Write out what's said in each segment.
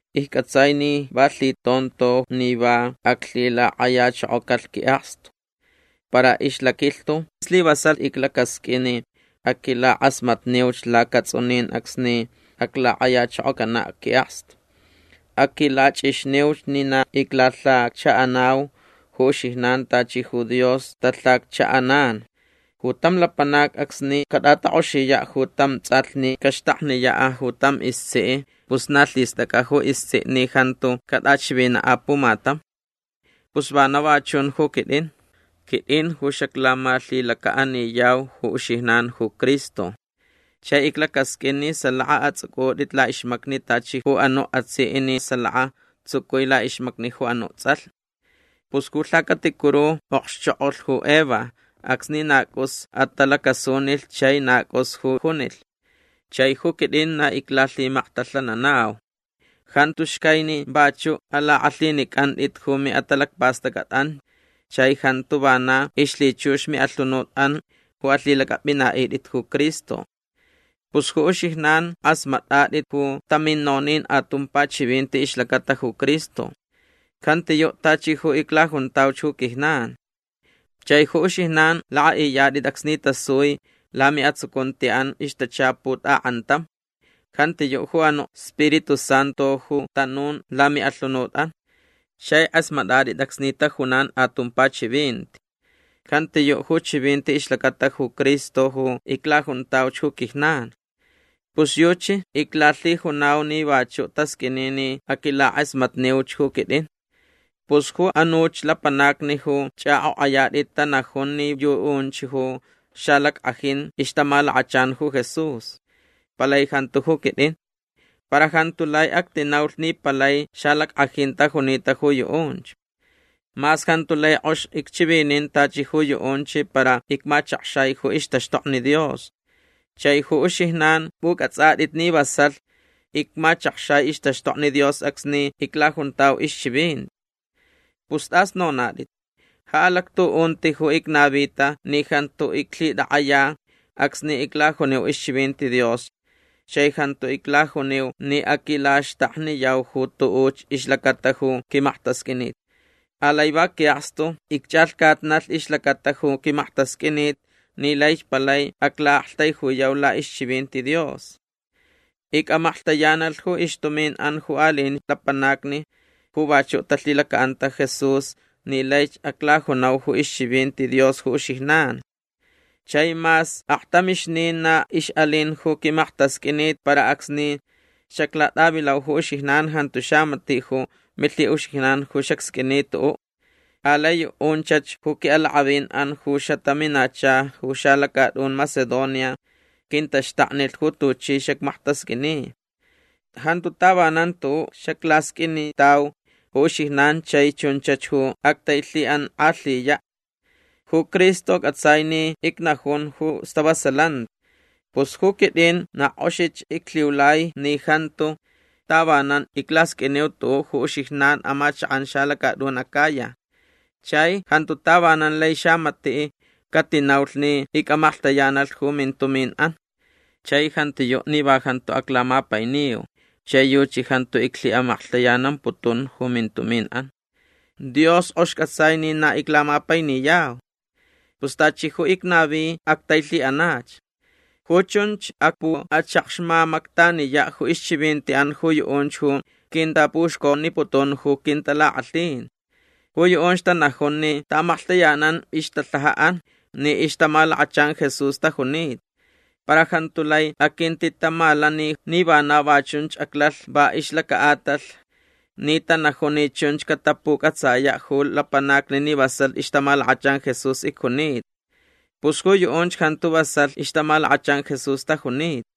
Icc'atsai ni va lhitonto ni va aclhilak'ayachokocalh qui'akstu. Para ixlaquilhtu slivasalh iclacasq'uin ni aquilak'asmatniuch lacats'unin acsni aclak'ayachokocana' qui'akstu. Aquilach'ixniuch ni na iclalhaccha'anau ju uxijnan tachi ju Dios talhaccha'anan. Ju tam lapanac acsni cat'atak'oxiya' ju tam ts'alh ni caxtakniya' ju tam istsi' pus na lhist'ac'a ju istsi' ni jantu cat'achivina' apumatam. Pus vana va chun ju quit'in. Quit'in ju xaclamalhilaca'aniyau ju uxijnan ju Cristo. Chai iclacasq'uin ni salaka ats'uc'ut'it la'ixmacni tachi ju anu' atsi' ni salaka tsucui la'ixmacni ju anu' ts'alh. Pus ju lhacaticuru okxchok'olh ju Eva acsni na c'us atalacasunilh chai na c'us ju junilh. Chai ju quit'in na iclalhimaktalhananau. Jantu xcai ni vachu' alak'alhinic'ant'it ju mi'atalacpast'ac'at'an chai jantu vana ixlhichux mi'alhunut'an ju alhilac'ap'ina'it'it ju Cristo. Pus ju uxijnan k'asmat'at'it ju tamin nonin atumpa chivinti ixlacata ju Cristo. Jantiyu' tachi ju iclajuntauch ju quijnan. Chai ju uxijnan lak'a'iyat'it acsni tasui lami'atsucunti'an ixtachaput ak'antam. Jantiyu' ju anu' Spiritu Santu ju tanun lami'alhunut'an. Chai k'asmat'at'it acsni tajunan atumpa chivinti. Jantiyu' ju chivinti ixlacata ju Cristo ju iclajuntauch ju quijnan. Pus yuchi iclalhijunau ni vachu' tasq'uini ni aquilak'asmatniuch ju quit'in. Pus ju anuch lapanacni ju ch'ak'ok'ayat'it tanajun ni yu'unch ju xalack'ajin ixtamalakachan ju Jesús. Palai jantu ju quit'in. Para jantu lai actinaulh ni palai xalack'ajin tajunita ju yu'unch. Mas jantu lai k'ox icchivinin tachi ju yu'unch para icmachakxai ju ixtaxtokni Dios. Chai ju uxijnan p'uc'ats'at'it ni vasalh icmachakxai ixtaxtokni Dios acsni iclajuntau ixchivinti. Pus t'as nonat'it. Ja alactu'unti ju icnavita ni jantu iclhitak'aya acsni iclajuniu ixchivinti Dios chai jantu iclajuniu ni aquilaxtakniyau ju tu'uch ixlacata ju quimaktasq'uinit. Alai va qui'akstu icch'alhcatnalh ixlacata ju quimaktasq'uinit ni laich palai acla'aktaijuyau la'ixchivinti Dios. Ic'amaklhtayanalh ju ixtumin'an ju ali'in lapanacni ju vachu' talhilaca'anta Jesús ni laich aclajunau ju ixchivinti Dios ju uxijnan. Chai mas aktamixnin na ix'alin ju quimaktasq'uinit para acsni xaclat'avilau ju uxijnan jantu xamati' ju milhi'uxijnan ju xacsq'uini tu'u'. Alai yu'unchach ju qui'alak'avin'an ju xataminacha ju xalacat'un Macedonia quintaxtaknilh ju tuchi xacmaktasq'uini. Jantu tavanan tu'u' xaclasq'uinitau ju uxijnan chai chunchach ju actailhi'ank'alhiya'. Ju Cristo c'atsai ni icnajun ju stavasalanti. Pus ju quit'in na k'oxich iclhiulai ni jantu tavanan iclasq'uiniu tu'u' ju uxijnan amachak'an xalacat'un Acaya. Chai jantu tavanan lai xamati' catinaulh ni ic'amaklhtayanalh ju mintumin'an. Chai jantiyu' ni va jantu iclamapainiyau chai yuchi jantu iclhi'amaklhtayanamputun ju mintumin'an. Dios k'ox c'atsai ni na iclamapainiyau. Pus tachi ju icnavi actailhi'anach. Ju chunch acpu'achakxmamactaniya' ju ixchivinti'an ju yu'unch ju quintapuxconiputun ju quintalak'alhin. Ju yu'unch tanajun ni ta'amaklhtayanan ixtalhaja'an ni ixtamalakachan Jesús tajunita. Para jantu lai aquintitamalani ni vana va chun aclalh va ixlaca'atalh ni tanajun ni chunch catapuc'atsaya' ju lapanacni ni vasalh ixtamalakachan Jesús icjunita. Pus ju yu'unch jantu vasalh ixtamalakachan Jesús tajunita.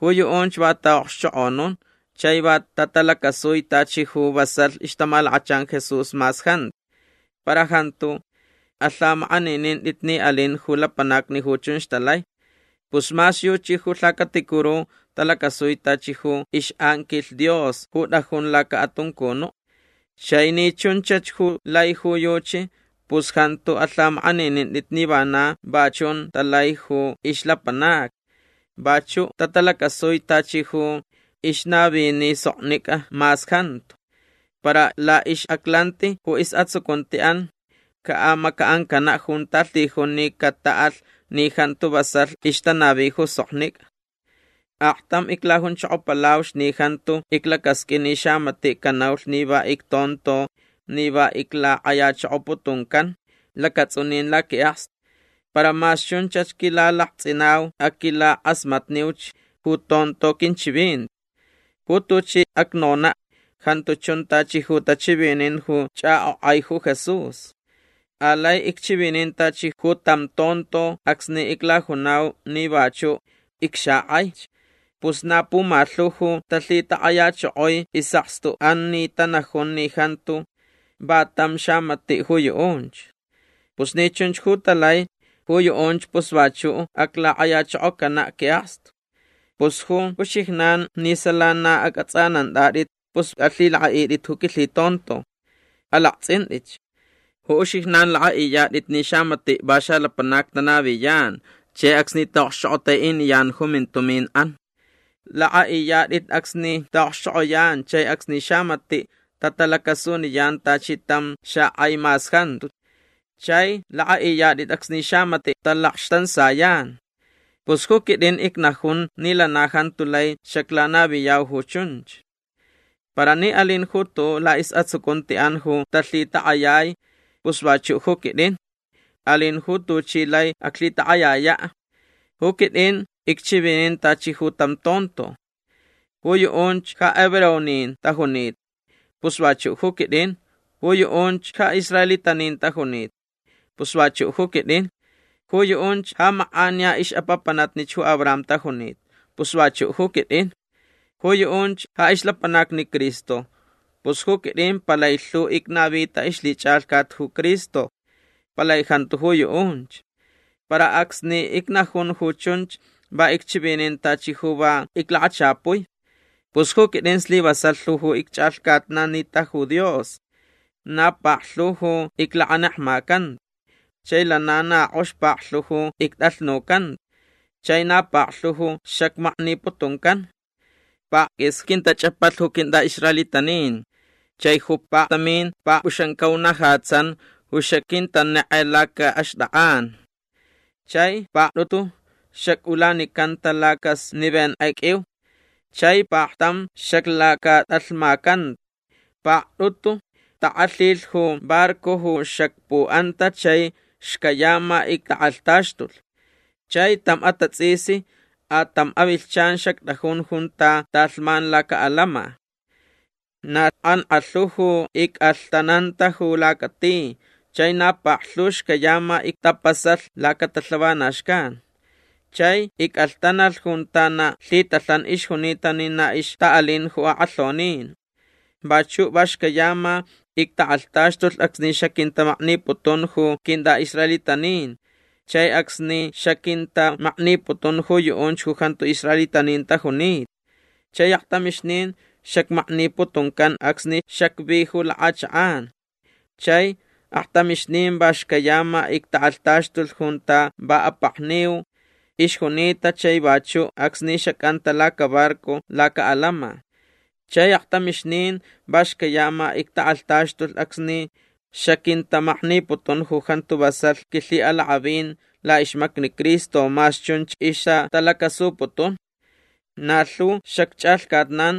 Ju yu'unch va ta'a'okxchok'onun chai va tatalacasui tachi ju vasalh ixtamalakachan Jesús mas jantu. Para jantu alhamak'aninint'it ni alin ju lapanacni ju chunch talai. Pus mas yuchi ju lhacaticuru talacasui tachi ju ix'anquilh Dios ju t'ajun laca'atuncunu'. Chai ni chunchach ju lai ju yuchi pus jantu alhamak'aninint'it ni vana va chun talai ju ixlapanacni. Vachu' tatalacasui tachi ju ixnavini soknic'a mas jantu. Para la'ix'aclanti ju is'atsucunti'an ca'amaca'ancana' junta lhijun ni cata'alh ni jantu vasalh ixtanavi ju soknic'a. Aktam iclajunchokopalauch ni jantu iclacasq'uin ni xamati' canaulh ni va ictonto ni va iclak'ayachokoputuncan lacats'unin laqui'akstu. Para mas chunch quilalakts'inau aquilak'asmatniuch ju tonto quinchivinti. Ju tuchi acnona' jantu chun tachi ju tachivinin ju ch'ak'ok'ai ju Jesús. Alai icchivinin tachi ju tam tonto acsni iclajunau ni vachu' icxak'aich. Pus na pumalhu ju talhitak'ayachokoi is'akstu'an ni tanajun ni jantu va tam xamati' ju yu'unch. Pus ni chunch ju talai ju yu'unch pus vachu' aclak'ayachokocana' qui'akstu. Pus ju uxijnan ni sala na ac'ats'anant'at'it pus alhilak'a'it'it ju quilhitonto. Alakts'int'itch. Ju uxijnan lak'a'iyat'it ni xamati' va xalapanac tanaviyan chai acsni ta'okxchok'otai'iniyan ju mintumin'an. Lak'a'iyat'it acsni ta'okxchok'oyan chai acsni xamati' tatalacasuniyan tachi tam xak'ai mas jantu. Chai lak'a'iyat'it acsni xamati' talakxtansayan. Pus ju quit'in icnajun ni lana jantu lai xaclanaviyau ju chunch. Para ni alin ju tu'u' la'is'atsucunti'an ju talhitak'ayai pus vachu' ju quit'in. Alin ju tuchi lai aclhitak'ayaya'. Ju quit'in icchivinin tachi ju tam tonto. Ju yu'unch ja hebreonin tajunita. Pus vachu' ju quit'in. Ju yu'unch ja israelitanin tajunita. Pus vachu' ju quit'in. Ju yu'unch ja mak'aniya ix'apapanatnich ju Abraham tajunita. Pus vachu' ju quit'in. Ju yu'unch ja ixlapanacni Cristo. Pus ju quit'in palai lhu icnavita ixlhich'alhcat ju Cristo. Palai jantu ju yu'unch. Para acsni icnajun ju chunch va icchivinin tachi ju va iclakachapui. Pus ju quit'in slivasalh lhu ju icch'alhcatnanita ju Dios. Na paklhu ju iclakanekmacanta. Chai lana na k'ox paklhu ju ict'alhnucanta. Chai na paklhu ju xacmakniputuncan. Pakquis quintach'apalh ju quint'a'israelitanin chai ju paktamin pakp'uxamcaunajatsan ju xaquintanek'e laca'axtak'an. Chai pakt'utu xac'ulanicanta lacasnivenk'e q'uiu. Chai paktam xaclacat'alhmacanta. Pakt'utu tak'alhilh ju barco ju xacpu'anta chai xcayama ictak'alhtaxtulh. Chai tam atats'isni a tam avilhchan xact'ajun junta talhman laca'alama. Na kankalhu ju ic'alhtananta ju lacati. Chai na paklhu xcayama ictapasalh lacatalhavanaxcan. Chai ic'alhtanalh junta na lhitalhan ixjunita ni na ixta'alin ju ak'alhonin. Vachu' va xcayama ictak'alhtaxtulh acsni xaquintamakniputun ju quint'a'israelitanin chai acsni xaquintamakniputun ju yu'unch ju jantu israelitanin tajunita. Chai aktamixnin xacmakniputuncan acsni xacvi ju lak'achak'an. Chai aktamixnin va xcayama ictak'alhtaxtulh junta va apakniu ixjunita chai vachu' acsni xac'anta lacabarco laca'alama. Chai aktamixnin va xcayama ictak'alhtaxtulh acsni xaquintamakniputun ju jantu vasalh quilhi'alak'avin la'ixmacni Cristo mas chunch ixtatalacasuputun. Na lhu xacch'alhcatnan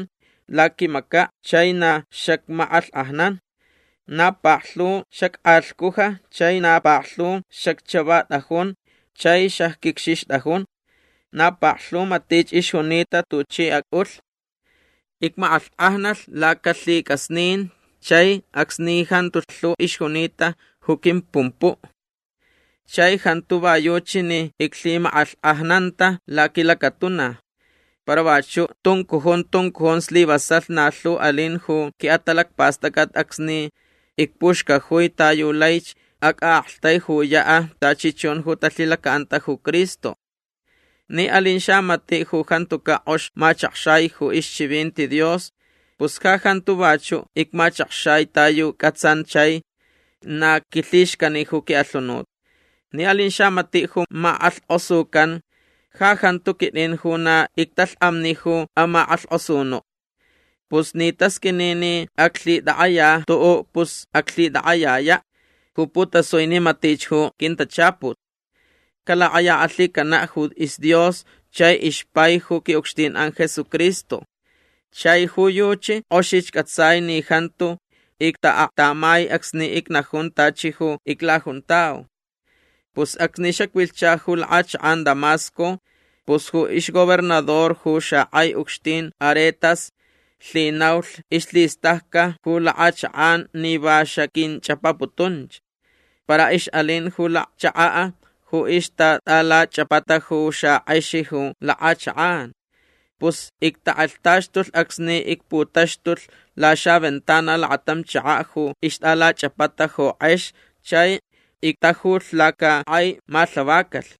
laquimaca' chai na xacmak'alhk'ajnan. Na paklhu xack'alhcujta chai na paklhu xacchavat'ajun chai xacquicxixt'ajun. Na paklhu matich ixjunita tuchi ac'ulh. Icmak'alhk'ajnalh lacalhic'asnin chai acsni jantu lhu ixjunita ju quimpumpu'. Chai jantu va yuchi ni iclhimak'alhk'ajnanta laquilacatuna. Para vachu' tuncujun tuncujun slivasalh na lhu alin ju qui'atalacpast'ac'at acsni icpuxcajui ta yu laich ac'a'aktaijuya' tachi chun ju talhilaca'anta ju Cristo. Ni alin xamati' ju jantuca' k'ox machakxai ju ixchivinti Dios pus ja jantu vachu' icmachakxai ta yu c'atsan chai na quilhixcani ju qui'alhunut. Ni alin xamati' ju mak'alhk'osucan ja jantu quit'in ju na ictalhk'amni ju amak'alhk'osunu'. Pus ni tasq'uini ni aclhitak'aya tu'u' pus aclhitak'ayaya' ju putasui ni matich ju quintachaput. Calak'ayak'alhicana' ju isDios chai ixpai ju qui'ucxtin'an Jesucristo. Chai ju yuchi k'oxich c'atsai ni jantu icta'aklhtamai acsni icnajun tachi ju iclajuntau. Pus acsni xacvilhcha ju lak'achak'an Damasco pus ju ixgobernador ju xak'ai ucxtin Aretas lhinaulh ixlhist'ac'a ju lak'achak'an ni va xaquinch'apaputunch. Para ix'alin ju lacchaka' ju ixtat'alach'apata ju xak'ex ju lak'achak'an. Pus ictak'alhtaxtulh acsni icputaxtulh laxaventana lakatam chaka' ju ixt'alach'apata ju k'ex chai ictajulh lacak'ai malhavacalh.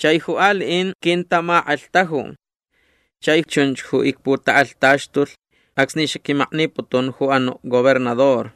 Chai ju ali'in quintamak'alhtaju. Chai chunch ju icputak'alhtaxtulh acsni xaquimakniputun ju anu' gobernador.